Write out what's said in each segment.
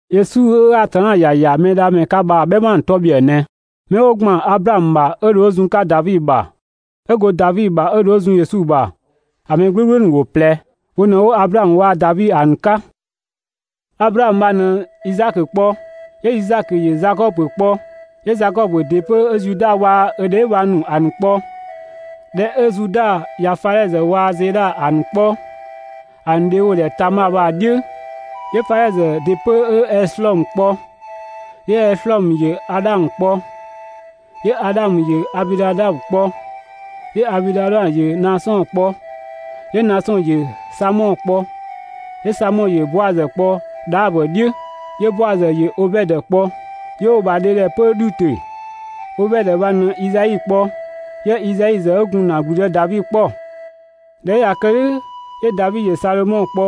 Yesu 'ö Atanna ‑ya ‑ya Mɛdhamɛ 'ka bha‑ "bhɛma ‑nu 'tɔ ‑bhiëë ꞊nɛ: 'Mɛ 'wo ‑gban Ablaamö bha 'ö dho 'ö zun‑ 'ka Davi ‑bha, 'ö go Davi ‑bha 'ö dho 'ö zun Yesu ‑bha. ‑A ‑mɛ "gblʋ̈gblʋ̈ ‑wo ꞊plɛ, wo ꞊në‑ 'wo Ablaamö waa‑ Davi ‑a ‑nu 'ka. Ablaamö bha ꞊në Izaakö kpɔ, 'yö Izaakö ‑yö Zakɔbö kpɔ, 'yö Zakɔbö ‑dɩ 'pö 'ö Zuda waa‑ ö dheebhang ‑nu ‑a ‑nu kpɔ. ꞊Dhɛ 'ö Zuda ꞊ya Fadhɛzö waa‑ Zedha ‑a ‑nu kpɔ, ‑a ‑nu dhe 'wo‑ ‑dhɛ Tama bha‑ "dhiʋ̈, 'yö Fadhɛzö ‑dɩ 'pö 'ö Eslɔɔmö kpɔ, 'yö Eslɔɔmö ‑yö Adhamö kpɔ, 'yö Adhamö ‑yö Abinadabö kpɔ, 'yö Abinadabö ‑yö Naasɔn kpɔ, 'yö Naasɔn ‑yö Samɔ kpɔ, 'yö Samɔ ‑yö Boazö kpɔ Dhaabö "dhiʋ̈, 'yö Boazö ‑yö Obɛdö kpɔ, 'yö 'wo‑ ‑bha dhe ‑dhɛ 'pö Dhutö. Obɛdö bha ꞊në Izai kpɔ, 'yö Izai ‑zë 'ö gun ‑na ‑gblüdë Davi 'kpɔ. ꞊Dhɛ 'ö ꞊ya kë "dhʋ̈, 'yö Davi ‑yö Sadhomɔ kpɔ,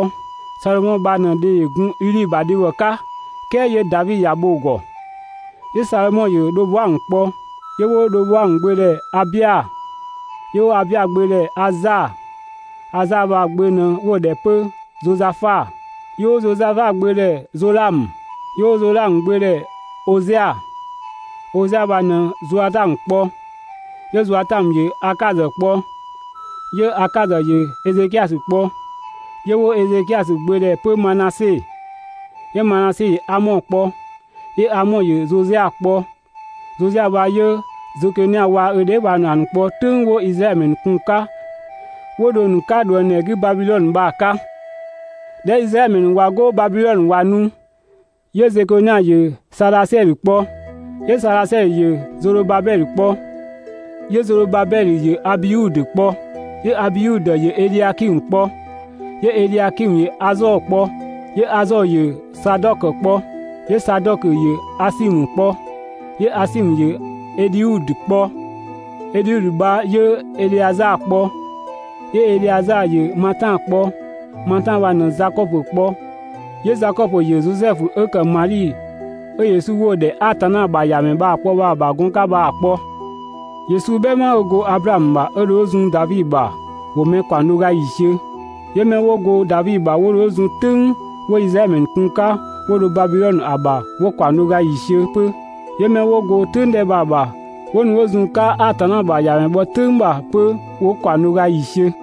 Sadhomɔ bha ꞊në‑ dhe ‑yö gun Udhi ‑bha dhebhɔ 'ka "kɛɛ 'yö Davi ‑ya bho‑ ‑gɔ. 'Yö Sadhomɔ ‑yö Dhoboamö kpɔ, 'yö 'wo Dhoboamö gbö ‑dhɛ Abia, 'yö 'wo Abia gbö ‑dhɛ Aza. Aza ‑bha gbö ꞊nɛ 'wo‑ ‑dhɛ 'pö Zozafa, 'yö 'wo Zozafa gbö ‑dhɛ Zolamö, 'yö 'wo Zolamö gbö ‑dhɛ Ozia, Ozia bha ꞊në Zoatamö kpɔ, 'yö Zoatamö ‑yö Akazö kpɔ, 'yö Akazö ‑yö Ezekiasö kpɔ, 'yö 'wo Ezekiasö gbö ‑dhɛ 'pö Manase, 'yö Manase ‑yö Amɔ kpɔ, 'yö Amɔ ‑yö Zozia kpɔ. Zozia bha 'yö Zekonia waa‑ ö dheebhang ‑nu ‑a ‑nu kpɔ "tʋ̈ng 'wo Izraɛdhö ‑mɛ ‑nu kun‑ 'ka 'wo dho‑ ‑nu 'ka ꞊dhuëngdhɛ 'gü Babidhɔnö bha‑ 'ka. ꞊Dhɛ 'ö Izraɛdhö ‑mɛ ‑nu ꞊wa 'go Babidhɔnö ꞊wa nu, 'yö Zekonia ‑yö Sadhasiɛdhö kpɔ, 'yö Sadhasiɛdhö ‑yö Zodhobabɛdhö kpɔ. 'Yö Zodhobabɛdhö ‑yö Abiudö kpɔ, 'yö Abiudö ‑yö Edhiakimö kpɔ, 'yö Edhiakimö ‑yö Azɔɔ kpɔ, 'yö Azɔɔ ‑yö Sadɔkö kpɔ, 'yö Sadɔkö ‑yö Asimö kpɔ, 'yö Asimö ‑yö Edhiudö kpɔ, Edhiudö bha 'yö Edheazaa kpɔ, 'yö Edheazaa ‑yö Matan kpɔ, Matan bha ꞊në Zakɔbö kpɔ, 'yö Zakɔbö ‑yö Zosɛfu 'ö ‑kë Madhi 'ö Yesu 'wo‑ ‑dhɛ Atanna ‑bha ‑Yamɛ bha‑ kpɔ bha‑ ‑bha gɔn 'ka bha‑ kpɔ. Yesu "bhɛma ‑nu 'ö go Ablaamö ‑bha 'ö dho 'ö zun Davi ‑bha ‑wo mɛ ‑kaɔng do ga ‑yiisiö, 'yö 'mɛ 'wo go Davi ‑bha 'wo dho 'wo zun "tʋ̈ng 'wo Izraɛdhö ‑mɛ ‑nu kun‑ 'ka, 'wo dho Babidhɔnö ‑a ‑bha bha 'wo ‑kaɔng do ga ‑yiisiö 'pö, 'yö 'mɛ 'wo go 'pö "tʋ̈ng 'dhɛ bha‑ ‑bha 'wo nu 'wo zun‑ 'ka Atanna ‑bha ‑Yamɛ bhɔ "tʋ̈ng ‑bha 'pö 'wo ‑kaɔng do ga ‑yiisiö.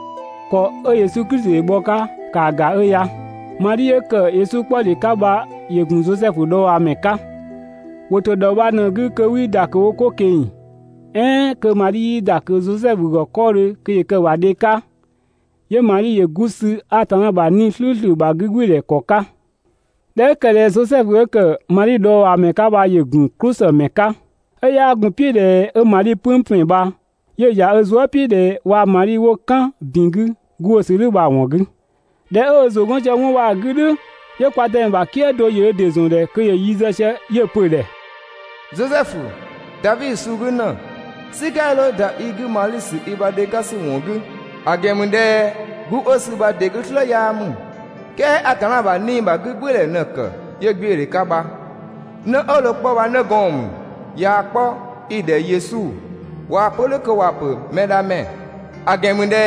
‑Kɔ 'ö Yesu Klisi ‑yö bhɔ‑ 'ka ‑kaa ‑ga 'ö ya: Madhi 'ö ‑kë Yesu 'kpɔdhe 'ka bha ‑yö ‑gun Zosɛfu dhɔɔbhaa ‑mɛ 'ka. ‑Wo ‑to ‑dhɔ bha ꞊në‑ 'gü kö 'wii ‑da ꞊kö wo 'ko ꞊keng‑ "ɛɛn kö Madhi 'yii ‑da ꞊kö Zosɛfu ‑gɔ 'kɔɔdhö kö ‑yö kë‑ ‑bha dhe 'ka, 'yö Madhi ‑yö 'gu sü Atanna ‑bha 'Nii‑ "slʋ̈ʋ̈slʋ̈ ‑bha 'gügbɩɩdhɛ ‑kɔ 'ka. ꞊Dhɛ 'ö ‑kë ꞊dhɛ Zosɛfu 'ö ‑kë Madhi dhɔɔbhaamɛ 'ka bha ‑yö ‑gun "klʋsëmɛ 'ka, 'ö 'yaa gun‑ "piʋ̈ ꞊dhɛ 'ö Madhi "pëng ‑pɛn bha, 'yö‑ ‑ya ö zuë" "piʋ̈ ꞊dhɛ waa‑ Madhi 'wo "kan ‑bin 'gü 'gu 'ö‑ sü "dhʋ̈ bha‑ ‑wɔn 'gü. ꞊Dhɛ 'ö ö ‑zʋ 'gɔn sië 'wɔn bha‑ 'gü "dhʋ̈, 'yö kwa Dëmɛ ‑bha "kië do ‑yö ö ‑dɩ ‑zɔn ‑dhɛ kö ‑yö yi zë sië 'yö‑ pö‑ ‑dhɛ: «Zosɛfu, Davi suu 'gü ‑në, "sika 'ya 'dho ‑da i 'gü Madhi ‑sü i ‑bha dhe 'ka ‑sü ‑wɔn 'gü, ‑a ‑gɛn ‑mü ꞊dhɛ 'gu 'ö‑ sü bha‑ ‑dɩ 'gü "slë 'yaa ‑mü, "kɛɛ Atanna ‑bha 'Nii‑ ‑bha 'gügbɩɩdhɛ ꞊në‑ ‑kë 'yö 'gbiödhe 'ka bha. 'Në 'ö dho‑ 'kpɔ bha 'nëgɔɔn ‑mü. ꞊Yaa‑ 'kpɔ, 'i‑ ‑dhɛ Yesu, (꞊Waa‑ pö "dhʋ̈ kö ‑wa ‑pö ‹Mɛdhamɛ›). ‑A ‑gɛn ‑mü ꞊dhɛ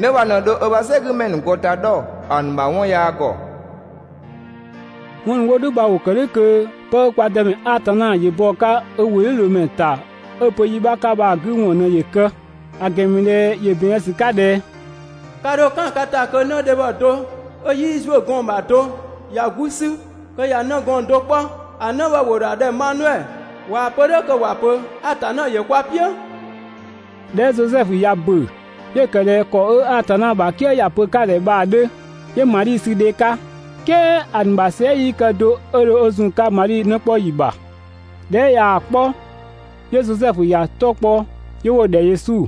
'në bha ꞊në dho ö ‑bha "sɛgümɛ ‑nu ‑gɔ ‑ta 'dhɔ ‑a ‑nu ‑bha 'wɔn yaa ‑gɔ.» 'Wɔn ‑nu 'wo "dhʋ̈ bha ‑wo ‑kë "dhʋ̈ kö 'pë 'ö kwa Dëmɛ Atanna ‑yö bɔ‑ 'ka ö ‑wʋdhiʋ̈loomɛ ‑ta 'ö‑ pö yi 'bha 'ka bha ꞊në‑ ‑nu 'gü ‑wɔn ‑yö kë. ‑A ‑gɛn ‑mü ꞊dhɛ ‑yö ‑bɛn zë ‑sü 'ka ꞊dhɛ: (Ka ‑dho "kan ka ‑ta kö) 'nëdhebhɔ do 'ö 'yii ‑zuö gɔɔn‑ ‑bha do ꞊ya 'gu 'sü kö ꞊ya 'nëgɔɔn do 'kpɔ, ‑a 'në bha ‑wo ‑dho ‑a ‑dhɛ Maniɛ.» (꞊Waa‑ pö "dhʋ̈ kö ‑wa pö ‹Atanna ‑yö kwa "piʋ̈›.) ꞊Dhɛ 'ö Zosɛfu ꞊ya ‑bö, 'yö‑ ‑kë ꞊dhɛ ‑kɔ 'ö Atanna ‑bha "kië ‑ya pö‑ 'ka‑ ‑dhɛ bha‑ 'dhö, 'yö Madhi sü dhe 'ka, "kɛɛ ‑a ‑nu ‑bha sɛɛ" 'yii kë do 'ö dho 'ö zun‑ 'ka Madhi 'në 'kpɔ ‑yi ‑bha. ꞊Dhɛ 'ö ꞊yaa‑ 'kpɔ, 'yö Zosɛfu ‑ya 'tɔ kpɔ, 'yö 'wo‑ ‑dhɛ Yesu.